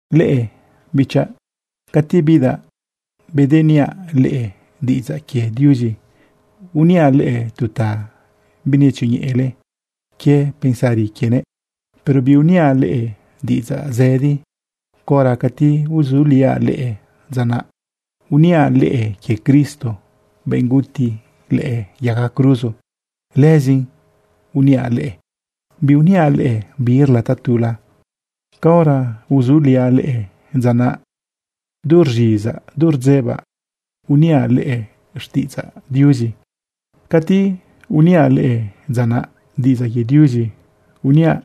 Leꞌe, bichaꞌ, cati bidaꞌ bedeniaꞌ leꞌe diꞌidzaꞌ quie Diuzi, uniaꞌ leꞌe tu ta binetzioñeꞌele quie pensari quienëꞌ, pero biuniaꞌ leꞌe diꞌidzaꞌ zëdi. Caora cati uzuliaꞌ leꞌe dza naꞌ, uniaꞌ leꞌe quie Cristo, benꞌ guti lëꞌë yaga cruzo. Lëzin uniaꞌ leꞌe, biuniaꞌ leꞌe birla tatula. Caora uzuliaꞌ leꞌe dza naꞌ, du rz̃izaꞌ du rdzebaꞌ, uniaꞌ leꞌe xtiꞌidzaꞌ Diuzi. Cati uniaꞌ leꞌe dza naꞌ, diꞌidzaꞌ quie Diuzi uniaꞌ.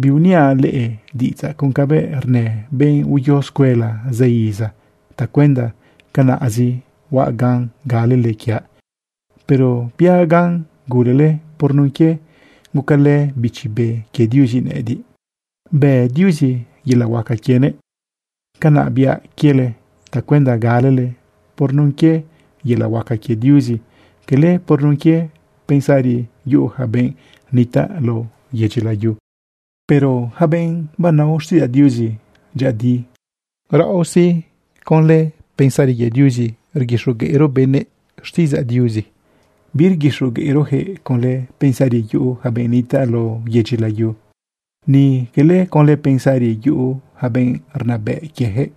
Biuniaꞌ leꞌe diꞌidzaꞌ con cabëꞌ rnë benꞌ uyo escuela zë iza tacuenda canaꞌzi huaꞌ gan galele quiaꞌ, pero biaꞌ gan gulele por nun quie gucalë Bichi Be quie Diuzi nëꞌëdiꞌ, bë Diuzi yelaꞌ huaca quienëꞌ. Canaꞌ biaꞌ quiele tacuenda galele por nun quie yelaꞌ huaca quie Diuzi, cala por nun quie pensari yuꞌu yaca benꞌ nitaꞌ lao yedyi layu. Pero yaca benꞌ banao xtiꞌidzaꞌ Diuzi dyëꞌëdi, raꞌo sí, conlë pensari quie Diuzi rguixogueꞌro benëꞌ xtiꞌidzaꞌ Diuzi. Birguixogueꞌrojëꞌ conlë pensari yuꞌu yaca benꞌ nitaꞌ lao yedyi layu, ni quele conlë pensari yuꞌu yaca benꞌ rnabëꞌ quieyaquëꞌ.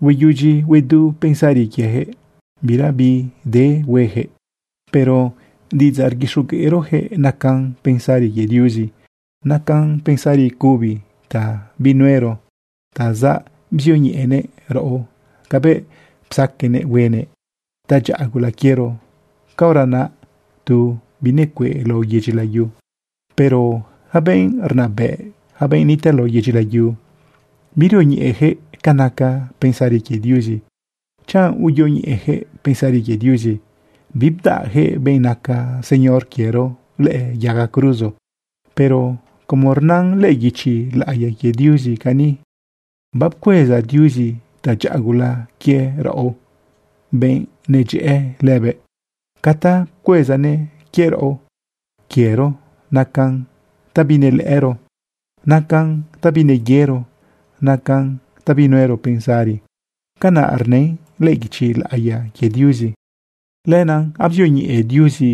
Hueyudyi huedu pensari quiejëꞌ, bira bide hueyaquëꞌ. Pero diꞌidzaꞌ rguixogueꞌrojëꞌ nacan pensari quie Diuzi, nacan pensari cubi ta binuero ta zabzioñeꞌenëꞌ raꞌo cabëꞌ psaqueꞌnëꞌ huenëꞌ tadyaꞌa gula quiero caora naꞌ tu binecueꞌ lao yedyi layu. Pero yaca benꞌ rnabëꞌ, yaca benꞌ nitaꞌ lao yedyi layu, birioñeꞌeyaquëꞌ ca naca pensari quie Diuzi. Chanꞌ uyoñeꞌeyaquëꞌ pensari quie Diuzi, bibdaꞌyaquëꞌ benꞌ naca Señor quiero lëꞌë yaga cruzo. Pero, como rnan lëꞌë guichi laꞌiya quie Diuzi cani: Bapcueza Diuzi tadyaꞌa gula quie raꞌo, benꞌ nedyëꞌë lëbëꞌ. Ca ta pcuezanëꞌ quie raꞌo, quiero, nacan ta binelëꞌëro, nacan ta bineyero, nacan ta binuero pensari. Canaꞌ rnën lëꞌë guichi laꞌiya quie Diuzi. Lenaꞌ abzioñeꞌe Diuzi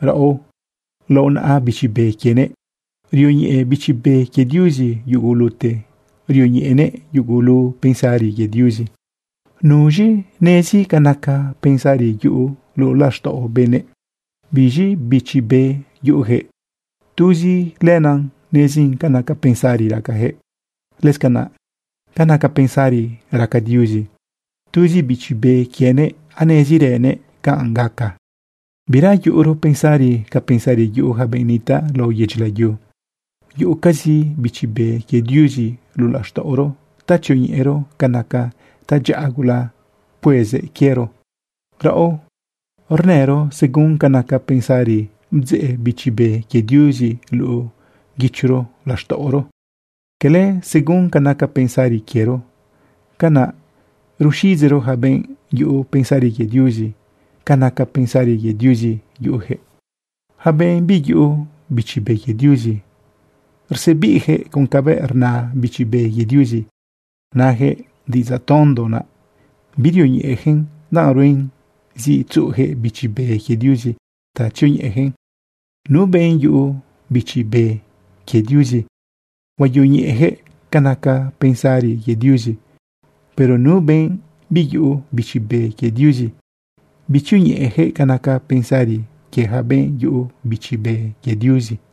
raꞌo lao naꞌa Bichi Be quienëꞌ. Rioñeꞌe Bichi Be quie Diuzi yugulute, rioñeꞌenëꞌ yugulu pensari quie Diuzi. ¿Nuz̃i nezi ca naca pensari yuꞌu luꞌu laxtaꞌo benëꞌ? Biz̃i bichi be yuꞌuyaquëꞌ, tuzi lenaꞌ nezin ca naca pensari racayaquëꞌ. Lëscanaꞌ ca naca pensari raca Diuzi, tuzi Bichi Be quienëꞌ anezirënëꞌ canꞌ gaca. Bira yuꞌuro pensari ca pensari yuꞌu yaca benꞌ nitaꞌ lao yedyi layu. Yuꞌucazi Bichi Be quie Diuzi luꞌu laxtaꞌoro ta tzioñeꞌero ca naca tadyaꞌa gula pcuezëꞌ quiero. Raꞌo rnëro según ca naca pensari bdzeꞌ Bichi Be quie Diuzi luꞌu guichoro laxtaꞌoro, cala según ca naca pensarizi quiero. Canaꞌ ruxiꞌidzeꞌro yaca benꞌ yuꞌu pensari quie Diuzi ca naca pensari quie Diuzi yuꞌujëꞌ. Yaca benꞌ biyuꞌu Bichi Be quie Diuzi, rsebiꞌyaquëꞌ con cabëꞌ rna Bichi Be quie Diuzi. Nayaquëꞌ diꞌidzaꞌ tondo naꞌ. Birioñeꞌeyaquëꞌn danꞌ ruen zi tzuꞌuyaquëꞌ Bichi Be quie Diuzi ta tzioñeꞌeyaquëꞌn. Nu benꞌ yuꞌu Bichi Be quie Diuzi, huayoñeꞌeyaquëꞌ ca naca pensari quie Diuzi. Pero nu benꞌ biyuꞌu Bichi Be quie Diuzi, bitzioñeꞌeyaquëꞌ ca naca pensari quie yaca benꞌ yuꞌu Bichi Be quie Diuzi.